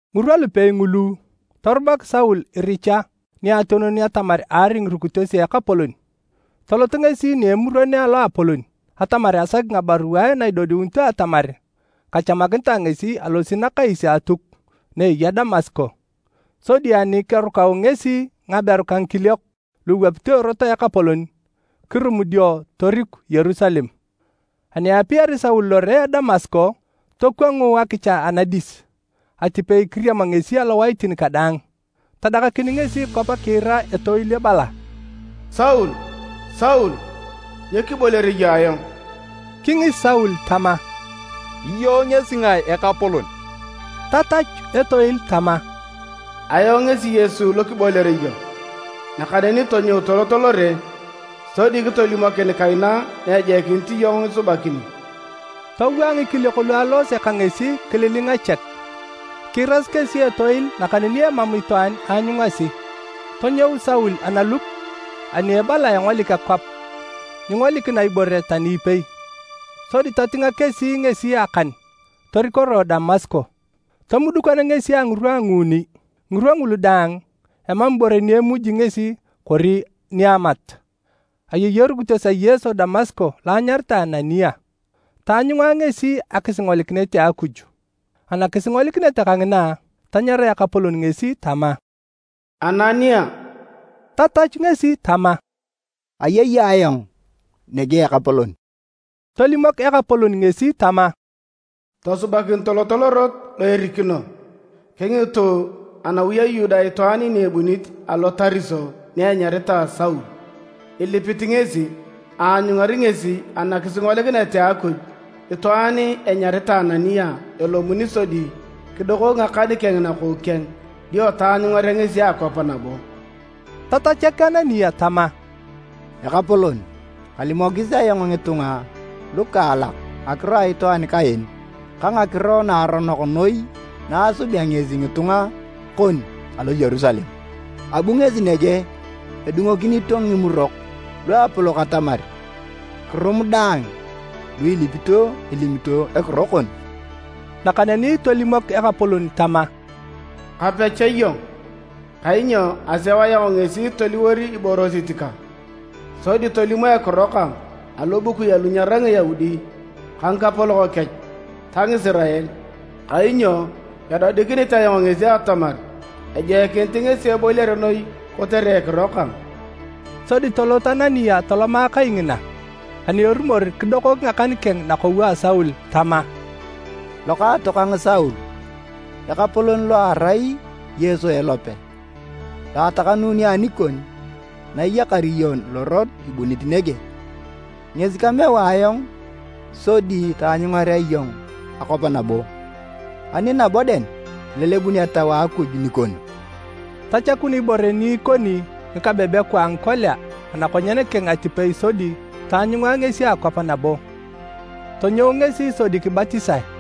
Ngirwa lupei ngulu, torubak Saul iricha niationon atamar aari ngirukitos a Ekapolon. Tolot ngesi ni Emuron a Loapolon atamar asaki ngabaruae na idodiunito atamar kachamakinitae ngesi alosi nakais a Atuk na eya Damasko. Sodi ani kerukau ngesi ngaberu ka ngikiliok lu iwapito Erot a Ekapolon, kirum dio toriku Yerusalem. Ani eapiari Saul lore a Damasko, tokwangu akicha anadis atipei kiriam ngesi alowaitin kadaang. Tadakakin ngesi kwap kiira etoil ebala, “Saul, Saul, nyo kiboliar iyong ayong?” Kingis Saul tama, “Iyong ngesi ngae, Ekapolon?” Tatachu etoil tama, “Ayong ngesi Yesu lo kiboliar iyong. Nakaneni tonyou tolot lore sodi kitolimokin kaina na ejoikinit iyong isubakini.” Towaa ngikiliok lu aloose ka ngesi kililinga chek. Kiirasi kesi etoil nakaneni emam itwaan aanyungasi. Tonyou Saul analup ani ebala engolik akwap, nyingolikina ibore tani ipei. Sodi totinga kesi ngesi akan torikoroe Damasko. Tomudukan ngesi a ngirwa a nguuni, ngirwa ngulu daang, emam ibore ni emuj ngesi kori niamat. Ayei erukitos a Yesu Damasko lo anyaritae Anania. Taanyunga ngesi akisingolikinet a Akuj. Anakisingolikinet kangina, tanyara Ekapolon ngesi tama, “Anania!” Tatachu ngesi tama, “Ayei ayong nege Ekapolon.” Tolimok Ekapolon ngesi tama, “Tosubakin tolot Lorot lo erikino, kingitu anawi a Yuda itwaan ni ebunit alo Tariso ni enyaritae Saul. Ilipit ngesi, aanyungari ngesi anakisingolikinet a Akuj itwaan enyaritae Anania elomuni sodi kidokok ngakan keng nakou keng dio taanyungarea ngesi akwap nabo.” Tatachak Anania tama, “Ekapolon, kalimokis ayong ngitunga lukaalak ngakiro a itwaan kaen ka ngakiro naaronok noi na asubea ngesi ngitunga kon alo Yerusalem. Abu ngesi nege edungokinito Ngimurok Luapolok atamar kirum daang lu ilipito elimito ekiro kon.” Nakaneni tolimok Ekapolon tama, “Kape cha iyong, kainyo aseu ayong ngesi toliwor iborosit kang, sodi tolimo ekiro kang alobukui alu nyerai Ngiyaudi ka ngikapolok kech ta Ngisirael. Kainyo edodikinit ayong ngesi atamar ejoikinit ngesi eboliare noi kotere ekiro kang.” Sodi tolot Anania toloma kai ngina. Ani erumor kidokok ngakan keng nakou a Saul tama, “Lokaatokang Saul, Ekapolon lo erai Yesu elope, lo atakanuuni anikon na iyakar iyong lorot ibunit nege. Ngesi kameu ayong sodi taanyungarea iyong akwap nabo, ani nabo dang, kilelebun Etau a Akuj nikon.” Tachakun ibore ni ikoni ngikabebekwa a ngikolia anakonyen keng atipei sodi taanyunga ngesi akwap nabo. Tonyou ngesi sodi kibatisae.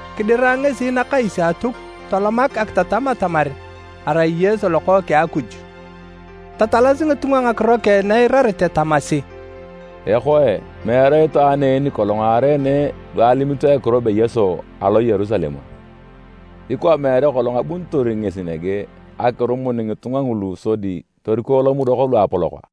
Kidira ngesi nakais a Atuk tolomak akitatam atamar arai Yesu Lokookeng a Akuj. Tatalasi ngitunga ngakiro keng na eirarete tamasi, “Ekoe, meere itwaan en nikolong aareene lu alimito ekiro be Yesu alo Yerusalem a? Ikwa meere kolong abunitor ngesi nege akirumun ngitunga ngulu sodi toriko Lomurok Luapolok a?”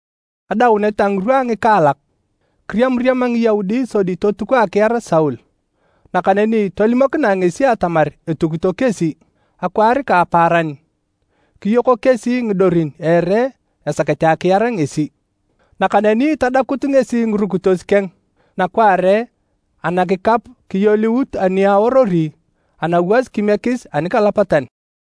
Adaunet a ngirwa a ngikaalak, kiriamariama Ngiyaudi sodi totuko akiar Saul, nakaneni tolimokinae ngesi atamar etukito kesi. Akwaar ka apaaran, kiyoko kesi ngidorin a ere esakete akiar ngesi. Nakaneni tadakut ngesi ngirukitos keng nakwaare anakikap kiyooliut ani aorori anawas kimiekis anikalapatan.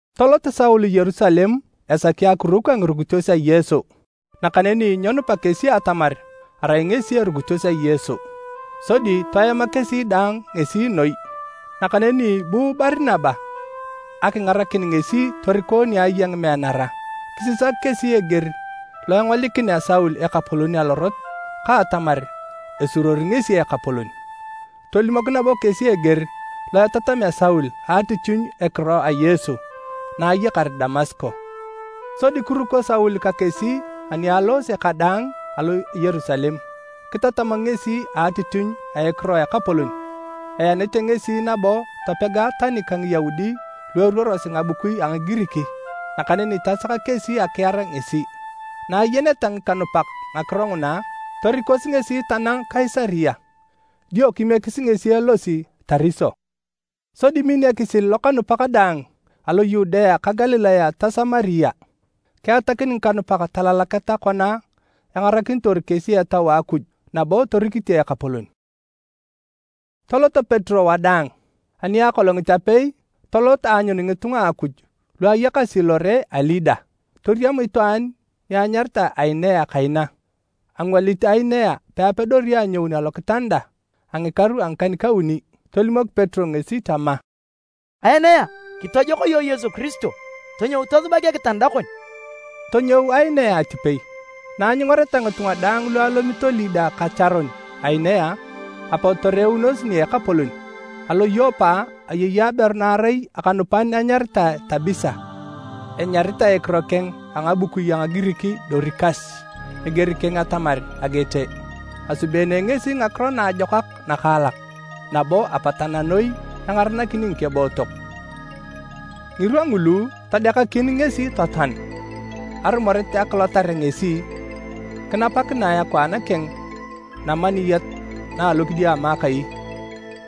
Tolot Saul Yerusalem esaki akiruk ka ngirukitos a Yesu. Nakaneni nyenupa kesi atamar arai ngesi erukitos a Yesu, sodi toema kesi daang ngesi noi. Nakaneni bu Barinaba akingarakin ngesi toriko ni aya ngimeanara. Kisisak kesi eger lo engolikinea Saul Ekapolon alorot ka atamar esuruori ngesi Ekapolon. Tolimok nabo kesi eger lo etatamea Saul a atitinyu a ekiro a Yesu na ayakar Damasko. Sodi kiruko Saul ka kesi ani aloose kadaang alo Yerusalem. Kitatam ngesi a atitinyu a ekiro a Ekapolon. Eanete ngesi nabo topega tani ka Ngiyaudi lu eruorosi ngabukui a Ngigirik, nakaneni tasaka kesi akiar ngesi. Na ayeneta ngikanupak ngakiro nguna, torikosi ngesi tanang Kaisaria dio kimiekis ngesi elosi Tariso. Sodi min ekisil lokanupak daang alo Yudea ka Galilaya ta Samaria. Kiatakin ngikanupak talalaketa kona engarakinitor kesi Etau a Akuj nabo torikite Ekapolon. Tolot Petero wadaang. Ani akolongit apei, tolot aanyun ngitunga a Akuj lu ayakasi lore a Lida. Toriam itwaan ni anyaritae Ainea kaina. Angwalit Ainea peapedori anyoun alokitanda a ngikaru a ngikan-kauni. Tolimok Petero ngesi tama, “Ainea, kitojok iyong Yesu Kiristo, tonyou tosubak ekitanda kon.” Tonyou Ainea atipei. Na anyungareta ngitunga daang lu alomito Lida ka Charon Ainea, apot toreunos nia Ekapolon. Alo Yopa, ayei aberu na arai akanupan anyaritae Tabisa. (Enyaritae ekiro keng a ngabukui a Ngigirik Dorikas, eger keng atamar “agete”.) Asubeene ngesi ngakiro naajokak nakaalak nabo apatana noi engaranakini ngikebootok. Ngirwa ngulu, todekakin ngesi totoan, arumoret akilotar ngesi, kinapakinae akwaan keng namaniyat na alokidiama akai.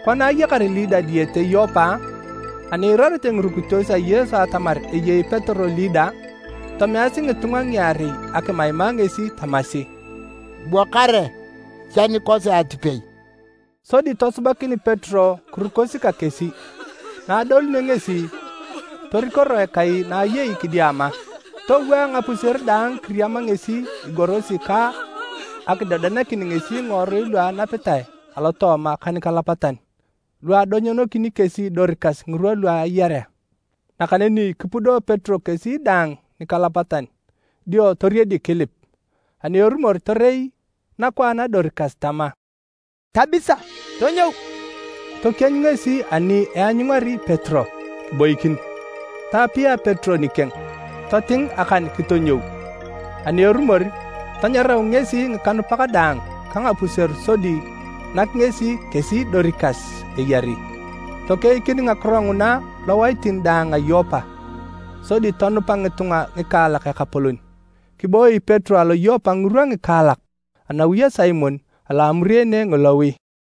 Kona ayakar Lida diyete Yopa, ani iirarete ngirukitos a Yesu atamar eyei Petero Lida, tomeasi ngitunga ngiarei akimaima ngesi tamasi, “Bua kare cha nikosi atipei.” Sodi tosubakin Petero kirukosi ka kesi. Na adolunio ngesi, torikoroe kai na ayei kidiama. Towaa ngapuseru daang kiriama ngesi igorosi ka akidodeanakin ngesi ngiworui lu enapitae alotooma ka nikalapatan lu adonyonokini kesi Dorikas ngirwa lu ayarea. Nakaneni kipudo Petero kesi daang nikalapatan dio toriedik kilip, ani erumor torei nakwaan a Dorikas tama, “Tabisa, tonyou!” Tokienyu ngesi ani eanyungari Petero, kiboikin. Taapia Petero nikeng, toting akan kitonyou. Ani erumor, tanyarau ngesi ngikanupak daang ka ngapuseru sodi nak ngesi kesi Dorikas eyari. Tokeikin ngakiro nguna lowaitin daang a Yopa sodi tonupa ngitunga ngikaalak Ekapolon. Kiboi Petero alo Yopa ngirwa ngikaalak anawi a Simon alo amureene ngilowi.